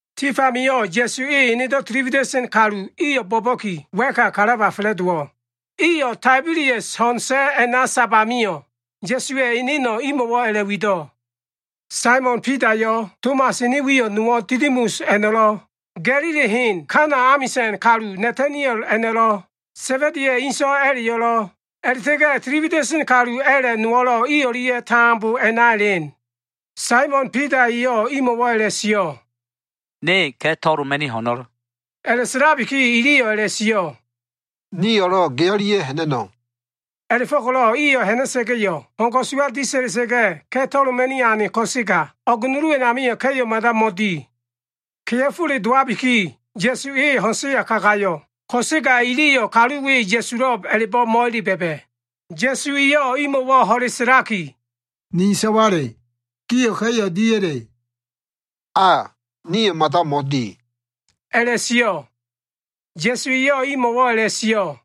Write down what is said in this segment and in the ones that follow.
Tif amio꞉ Ya꞉su e enedo꞉ tili wida꞉sen kalu iyo꞉ bo꞉ba꞉ki, wa꞉ka kalaba fa꞉la꞉dowo꞉. Iyo꞉ Taibelias ho꞉n sa꞉ a꞉na sab amio꞉, Ya꞉suwa꞉ eneno꞉ imo꞉wo꞉ a꞉la꞉wido꞉. Saimon Bidayo꞉, Tomas ene wi nowo꞉ Didimus a꞉no꞉lo꞉, Ga꞉lili hen Kana amisa꞉n kalu Nataniel a꞉no꞉lo꞉, Sa꞉ba꞉diya꞉ inso꞉ a꞉la꞉yo꞉lo꞉, a꞉la꞉ta꞉ga꞉ tili wida꞉sen kalu a꞉la꞉ nowo꞉ i o꞉lia꞉ tambo a꞉na elen. Saimon Bida eyo꞉ imo꞉wo꞉ a꞉la꞉sio꞉, “Ne ka꞉ to꞉loma꞉ni ho꞉no꞉l.” A꞉la꞉sa꞉labiki, iliyo꞉ a꞉la꞉sio꞉, “Nio꞉lo꞉ ge o꞉lia꞉ ha꞉na꞉no꞉.” A꞉la꞉fo꞉ko꞉lo꞉ iyo꞉ ha꞉na꞉sa꞉ga꞉yo꞉, ho꞉n ko꞉suwa disa꞉lia꞉ga꞉, ka꞉ to꞉loma꞉ni ane ko꞉sega, o꞉g nulu a꞉namio꞉ ka꞉yo꞉ mada mo꞉di. Kea꞉fole dowabiki, Ya꞉su e ho꞉n sa꞉ya kagayo꞉, ko꞉sega iliyo꞉ kalu we Ya꞉sulo꞉b a꞉la꞉bo꞉ mo꞉ele ba꞉ba꞉. Ya꞉su eyo꞉ imo꞉wo꞉ ho꞉le sa꞉laki, “Ni so꞉wale, gio꞉ ka꞉yo꞉ diya꞉le?” “A, niliyo꞉ mada mo꞉di” a꞉la꞉sio꞉. Ya꞉su eyo꞉ imo꞉wo꞉ a꞉la꞉sio꞉,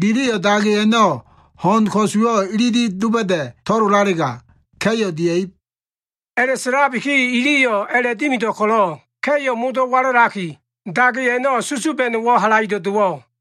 “Giliyo꞉ dage a꞉no꞉ ho꞉n ko꞉suwo꞉ ililib doba꞉da꞉ to꞉lolalega, ka꞉yo꞉ dia꞉ib.” A꞉la꞉sa꞉labiki, iliyo꞉ a꞉la꞉dimido꞉ ko꞉lo꞉, ka꞉yo꞉ modo꞉ walalaki, dage a꞉no꞉ susuba꞉no꞉wo꞉ halaido꞉ dowo꞉.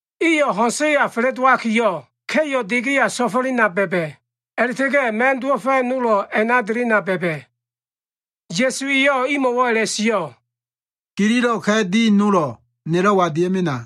Iyo꞉ ho꞉n sa꞉ya fa꞉la꞉dowakiyo꞉, ka꞉yo꞉ de geya so꞉fo꞉lena ba꞉ba꞉. A꞉la꞉ta꞉ga꞉ ma꞉n dowo꞉fa꞉ nolo꞉ a꞉na delena ba꞉ba꞉. Ya꞉su eyo꞉ imo꞉wo꞉ a꞉la꞉sio꞉, “Gililo꞉ ka꞉ di nolo꞉ nelo꞉wa dia꞉mena.”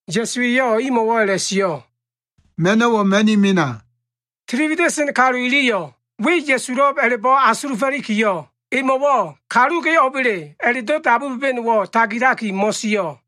Ya꞉su eyo꞉ imo꞉wo꞉ a꞉la꞉sio꞉, “Ma꞉no꞉wo꞉ ma꞉ni mena.” Tili wida꞉sen kalu iliyo꞉ we Ya꞉sulo꞉b a꞉la꞉bo꞉ asulufo꞉likiyo꞉, emo꞉wo꞉ “Kalu ge o꞉ba꞉le?” a꞉la꞉do꞉ dabu ba꞉ba꞉no꞉wo꞉ tagilaki mo꞉sio꞉.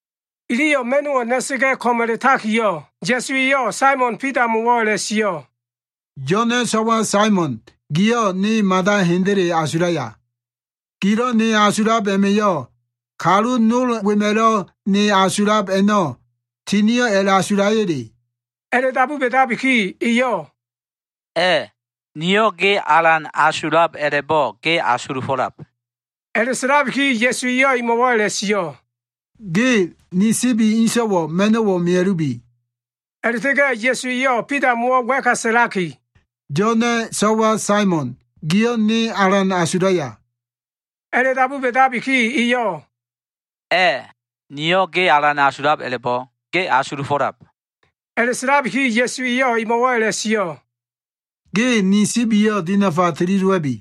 Iliyo꞉ ma꞉no꞉wo꞉ na꞉sa꞉ga꞉ ko꞉m a꞉la꞉takiyo꞉, Ya꞉su eyo꞉ Saimon Bidamo꞉wo꞉ a꞉la꞉sio꞉, “Yo꞉na꞉ so꞉wa Saimon giyo꞉ ne mada hendele asulaya? Gilo꞉ ne asulab a꞉ma꞉yo꞉ kalu nol wema꞉lo꞉ ne asulab a꞉no꞉ tinio꞉ a꞉la꞉asulaya꞉le?” A꞉la꞉dabu ba꞉dabiki eyo꞉, “A꞉, niyo꞉ ge alan asulab a꞉la꞉bo꞉ ge asulufo꞉lab.” A꞉la꞉sa꞉labiki Ya꞉su eyo꞉ emo꞉wo꞉ a꞉la꞉sio꞉, “Ge ni sibi inso꞉wo꞉ ma꞉no꞉wo꞉ mea꞉lubi.” A꞉la꞉ta꞉ga꞉ Ya꞉su eyo꞉ Bidamo꞉wo꞉ wa꞉ka sa꞉laki, “Yo꞉na꞉ so꞉wa Saimon, giyo꞉ ne alan asulaya?” A꞉la꞉dabu ba꞉dabiki, eyo꞉, “A꞉, niyo꞉ ge alan asulab a꞉la꞉bo꞉ ge asulufo꞉lab.” A꞉la꞉sa꞉labiki Ya꞉su eyo꞉ emo꞉wo꞉ a꞉la꞉sio꞉, “Ge ni sibiyo꞉ dinafa tili dowa꞉bi.”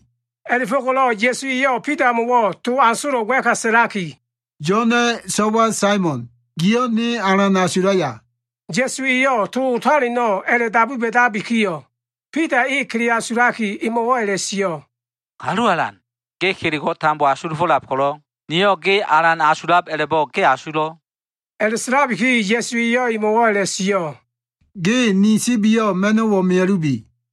A꞉la꞉fo꞉ko꞉lo꞉ Ya꞉su eyo꞉ Bidamo꞉wo꞉ to asolo꞉ wa꞉ka sa꞉laki, “Yo꞉na꞉ so꞉wa Saimon, giyo꞉ ne alan asulaya?” Ya꞉su eyo꞉ to otaleno꞉ a꞉la꞉dabu ba꞉dabikiyo꞉, Bida e kele asulaki emo꞉wo꞉ a꞉la꞉sio꞉, “Kalu Alan, ge kelego꞉ tambo asulufo꞉lab ko꞉lo꞉, niyo꞉ ge alan asulab a꞉la꞉bo꞉ ge asulo꞉.” A꞉la꞉sa꞉labiki Ya꞉su eyo꞉ emo꞉wo꞉ a꞉la꞉sio꞉, “Ge ni sibiyo꞉ ma꞉no꞉wo꞉ mea꞉lubi.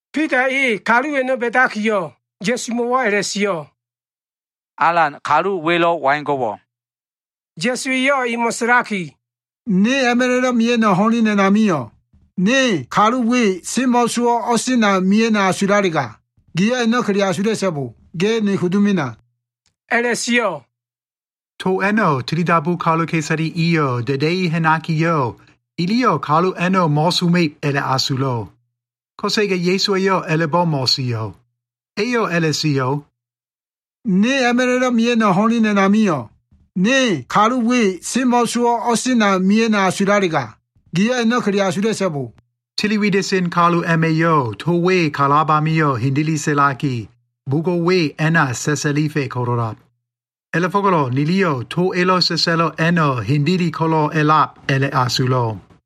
Bida e kalu a꞉no꞉ ba꞉dakiyo꞉, Ya꞉sumo꞉wo꞉ a꞉la꞉sio꞉, “Alan, kalu welo꞉ waigo꞉wo꞉?” Ya꞉su eyo꞉ emo꞉ sa꞉laki, “Ne a꞉ma꞉la꞉do꞉ mia꞉no꞉ ho꞉len a꞉namio꞉, niyo꞉ kalu we semo꞉ sowo꞉ka o꞉sena mia꞉no꞉ asulalega, giyo꞉ a꞉no꞉ kele asula꞉so꞉bo. Ge ne kudu mena” a꞉la꞉sio꞉. To a꞉no꞉ tilidabu kaluka꞉isale iyo꞉ da꞉da꞉i ha꞉nakiyo꞉, iliyo꞉ kalu a꞉no꞉ mo꞉soma꞉ib a꞉la꞉asulo꞉. Ko꞉sega Ya꞉su eyo꞉ a꞉la꞉bo꞉ mo꞉sio꞉. Eyo꞉ a꞉la꞉sio꞉, “Ne a꞉ma꞉la꞉do꞉ mia꞉no꞉ ho꞉len a꞉namio꞉, niyo꞉ kalu we semo꞉ sowo꞉ka o꞉sena mia꞉no꞉ asulalega, giyo꞉ a꞉no꞉ kele asula꞉so꞉bo.” Tili wida꞉sen kalu a꞉ma꞉yo꞉ to we kalab amio꞉ hendele sa꞉laki, bugo꞉ we a꞉na sa꞉sa꞉lifa꞉ ko꞉lo꞉lab. A꞉la꞉fo꞉ko꞉lo꞉ niliyo꞉ to elo꞉ sa꞉sa꞉lo꞉ a꞉no꞉ hendele ko꞉lo꞉ a꞉lab a꞉la꞉asulo꞉.